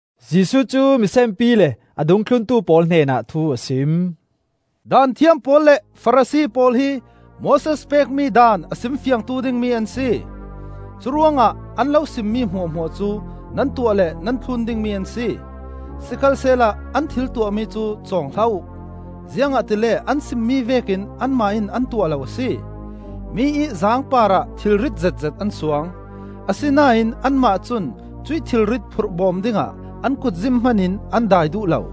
Jesuh cu misenpi le a dungthluntu pawl hnenah thu a sim. “Daanthiam pawl le Farasi pawl hi Moses pekmi Daan a sim fiangtu dingmi an si. Curuangah an lo simmi hmuahhmuah cu nan tuah le nan thlun dingmi an si, sikhalsehla an thil tuahmi cu cawng hlah uh; ziangahtile an simmi vekin anmah in an tuah lo a si. Mi ih zaang parah thilrit zetzet an suang, asinain anmah cun cuih thilrit phurh bawm dingah an kutzim hman in an dai duh lo.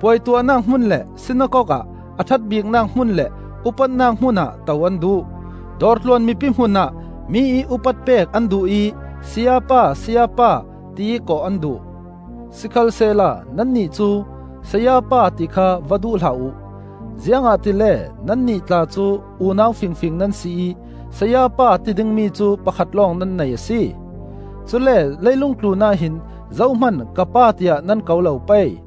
Puai tuahnak hmun le sinakok ah a ṭhat biknak hmun le upatnak hmun ah to an duh. Dawr tluan mipi hmun ah mi ih upat pek an duh ih, ‘Sayapa, Sayapa,’ tiih kawh an duh. Sikhalsehla nannih cu, ‘Sayapa,’ ti kha va duh hlah uh! Ziangahtile nannih tla cu unau fingfing nan si ih Sayapa ti dingmi cu pakhat lawng nan nei a si. Cule leilung tlunah hin zohman, ‘Ka Pa,’ tiah nan ko lo pei,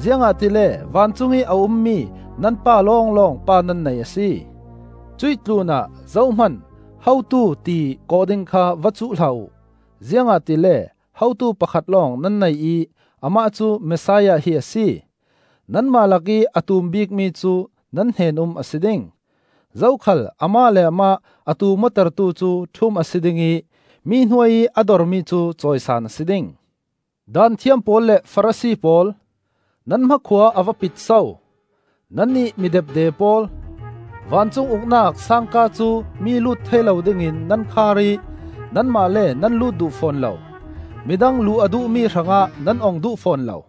ziangahtile vancung i a ummi nan Pa lawnglawng Pa nan nei a si. Cuih tlunah zohman, ‘Hotu,’ ti kawh ding kha va cuh hlah uh, ziangahtile hotu pakhat lawng nan nei ih amah cu Messiah hi a si. Nanmah lakih a tum bik mi cu nan hnen-um a si ding. Zokhal amah le amah a tum awtertu cu ṭhum a si ding ih mi hnuai ih a dormi cu cawisan a si ding. “Daanthiam pawl le Farasi pawl, nan hmakhua a va pit so! Nannih mi depde pawl! Vancung Uknak sangka cu mi lut thei lo dingin nan khar ih nanmah le nan lut duh fawn lo; midang luh a duhmi hrangah nan ong duh fawn lo.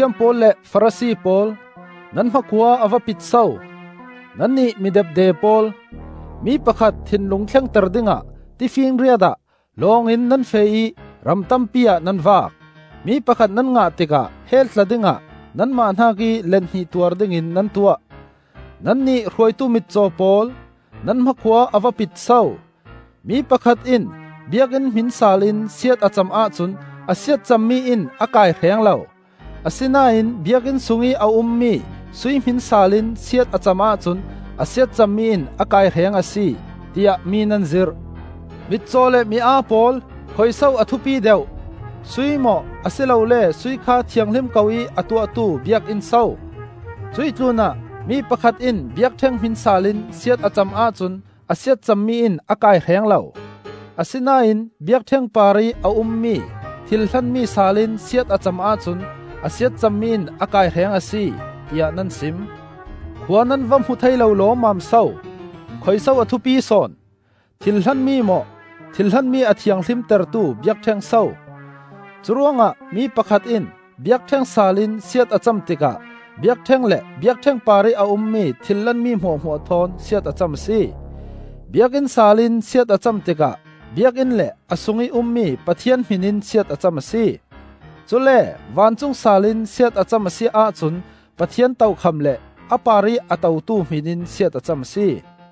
“Daanthiam pawl le Farasi pawl, nan hmakhua a va pit so! Nannih mi depde pawl! Mi pakhat thinlung thlengter dingah tifinriat ah lawng in nan feh ih ram tampi ah nan vak. Mi pakhat nan ngah tikah hell tla dingah nanmah hnakih let hnih tuar dingin nan tuah. “Nannih hruaitu mitcaw pawl, nan hmakhua a va pit so! ‘Mi pakhat in Biakinn hmin saal in siat a cam ahcun a siatcammi in a kaihreng lo, asinain Biakinn sungih a ummi sui hmin saal in siat a cam ahcun a siatcammi in a kaihreng a si,’ tiah mi nan zirh. Mitcaw le mi aa pawl! Khuiso a thupi deuh? Sui maw, a si lole sui kha thianghlim ko ih a tuahtu Biakinn so? Cuih tlunah, ‘Mi pakhat in biakṭheng hmin saal in siat a cam ahcun a siatcammi in a kaihreng lo; asinain biakṭheng parih a ummi thilhlanmi saal in siat a cam ahcun a siatcammi in a kaihreng a si,’ tiah nan sim. Khua nan va hmu thei lo lawmmam so! Khuiso a thupi sawn? Thilhlanmi maw, thilhlanmi a thianghlimtertu biakṭheng so? Curuangah mi pakhat in biakṭheng saal in siat a cam tikah biakṭheng le biakṭheng parih a ummi thilhlanmi hmuahhmuah thawn siat a cam a si. Biakinn saal in siat a cam tikah biakinn le a sungih ummi Pathian hmin in siat a cam a si. Cule vancung saal in siat a cam a si ahcun Pathian tokham le a parih a totu hmin in siat a cam a si.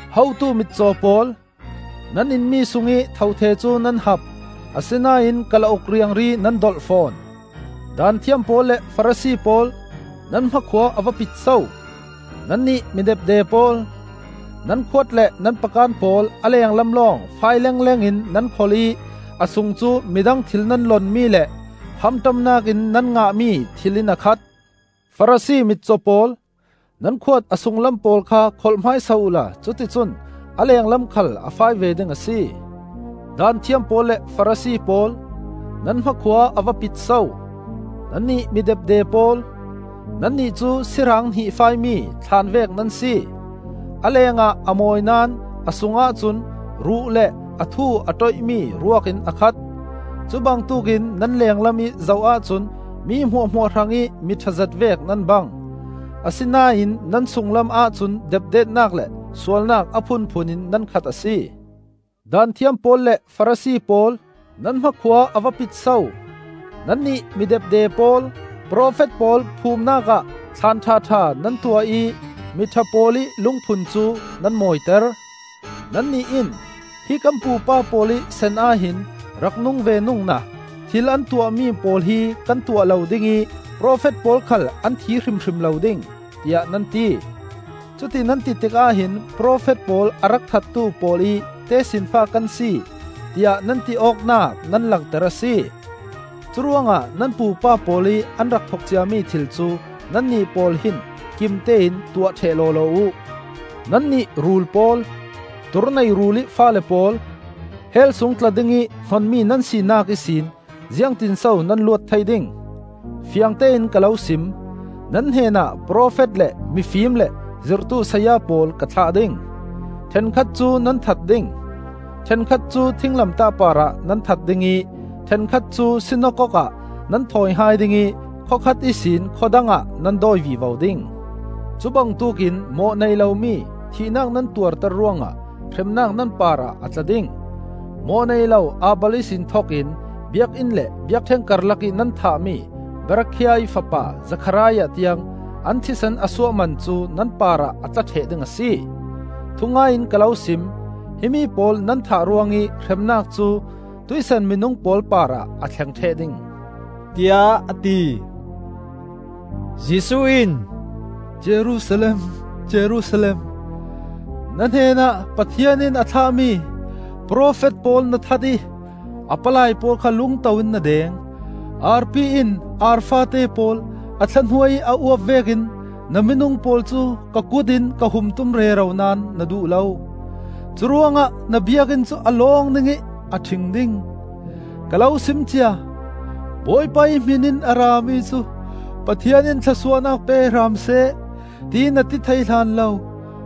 Hotu mitcaw pawl! Nan inmi sungih thothe cu nan hap, asinain kalauk riangri nan dolh fawn! “Daanthiam pawl le Farasi pawl, nan hmakhua a va pit so! Nannih mi depde pawl! Nan khuat le nan pakan pawl a lenglam lawng fai lengleng in nan kholh ih a sung cu midang thil nan lonmi le hamṭamnak in nan ngahmi thil in a khat. Farasi mitcaw pawl! Nan khuat a sunglam pawl kha kholh hmaisa uhla cuticun a lenglam khal a fai ve ding a si. “Daanthiam pawl le Farasi pawl, nan hmakhua a va pit so! Nannih mi depde pawl! Nannih cu si raang hnihfaimi thlaan vek nan si; a lengah a mawi naón a sungah cun ruh le a thu a ṭoih mi ruak in a khat. Cubangtuk in nan lenglam ih zoh ahcun mi hmuahhmuah hrangih mi ṭhazet vek nan bang, asinain nan sunglam ahcun depdetnak le sualnak a phunphun in nan khat a si. “Daanthiam pawl le Farasi pawl, nan hmakhua a va pit so! Nannih mi depde pawl! Profet pawl phumnak ah thlaan ṭhaṭha nan tuah ih mi ṭha pawl ih lungphun cu nan mawiter. Nannih in, ‘Hi kan pupa pawl ih san ahhin rak nung ve nungna thil an tuahmi pawl hi kan tuah lo ding ih profet pawl khal an thi hrimhrim lo ding,’ tiah nan ti. Cuti nan ti tikah hin profet pawl a rak thattu pawl ih tesinfa kan si, tiah nan ti awknak nan langter a si. Curuangah nan pupa pawl ih an rak thok ciami thil cu nannih pawl hin kimtein tuah ṭheh lawlaw uh! Nannih rul pawl, tur nei rulih faale pawl! Hell sung tla dingih hnonmi nan sinak ihsin ziangtinso nan luat thei ding? Fiangtein ka lo sim: nan hnenah profet le mifim le zirhtu saya pawl ka thlah ding; ṭhenkhat cu nan that ding, ṭhenkhat cu thinglamtah parah nan that ding ih ṭhenkhat cu sinakok ah nan thawi hai ding ih khua khat ihsin khua dangah nan dawi vivo ding. Cubangtuk in mawh nei lomi thihnak nan tuarter ruangah hremnak nan parah a tla ding. Mawh nei lo Abel ihsin thokin Biakinn le biakṭheng karlakih nan thahmi Berakhiah ih fapa Zekhariah tiang, an thisen a suah man cu nan parah a tla ṭheh ding a si. Thungai in ka lo sim: himi pawl nan thah ruangih hremnak cu tuihsan minung pawl parah a thleng ṭheh ding,” tiah a ti. Jesuh in, “Jerusalem, Jerusalem! Na hnenah Pathian in a thlahmi profet pawl na that ih a palai pawl kha lungto in na deng. Arpi in ar faate pawl a thla hnuai ih a uap vekin na minung pawl cu ka kut in ka hum tum rero naón na duh lo! Curuangah na Biakinn cu a lawng ding ih a ṭhing ding. Ka lo sim cia: ‘Bawipa ih hmin in a rami cu Pathian in thlawsuahnak pe hram seh,’ tiih na ti thei hlan lo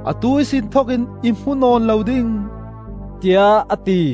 atu ihsin thok in i hmu nawn lo ding,” tiah a ti.